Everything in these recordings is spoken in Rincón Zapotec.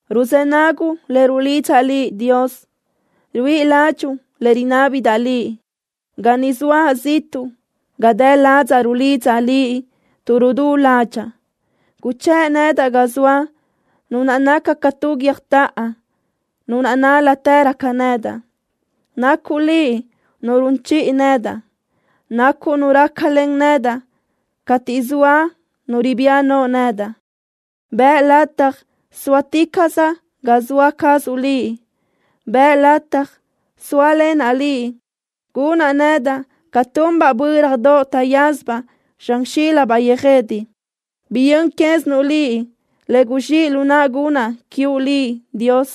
Ruzë́ naguʼ le rulidzaʼ Liʼ, Dios. Ruíʼi ládxuʼu le rinábidaʼ Liʼ. Ga ni zoaʼ ziʼtuʼ ga dë ladzaʼ rulidzaʼ Liʼ tuʼ rudú ládxaʼa. Guchë́ʼ nedaʼ ga zoa Nu naʼ naca ca tu guiö́jtoʼo, Nu naʼ nál-latërö ca nedaʼ. Nacuʼ Liʼ Nu run chiʼi nedaʼ. Nacuʼ Nu rácalen nedaʼ cateʼ zoa nu ribía no nedaʼ. Bëʼ lataj sóaticaʼsaʼ ga zoa cazuʼ Liʼ. Bëʼ lataj sóalenaʼ Liʼ, gunaʼ nedaʼ ca tunbaʼ bö́radoʼ taʼyázabaʼ zxan xílabaʼ yöjede. Biyö́n quézinuʼ Liʼ le guzxíʼ lu naʼa gunaʼ quiuʼ Liʼ, Dios.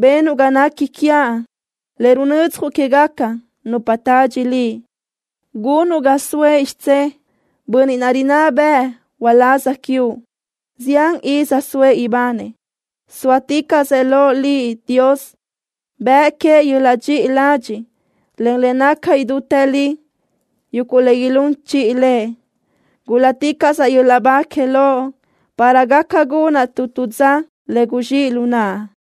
Benuʼ ga nequi quiaʼ le runödzjuʼ quégaca nupa tadxi Liʼ. Gunuʼ ga soëʼ xidzé bönniʼ naʼ rinná bëʼë uláz quiuʼ. Zián iz soëʼ ibanëʼ. Sóaticaʼsëʼ loʼ Liʼ, Dios. Bëʼ queëʼ yöl-laʼ dxiʼi ladxiʼ, en le naca idútë li, yuguʼ le ilún chiʼi lëʼ. ¡Gúl-laticaʼsaʼ yöl-laʼ ba que Loʼ, para gaca gunaʼ tu tu dza le guzxíʼ lu naʼa!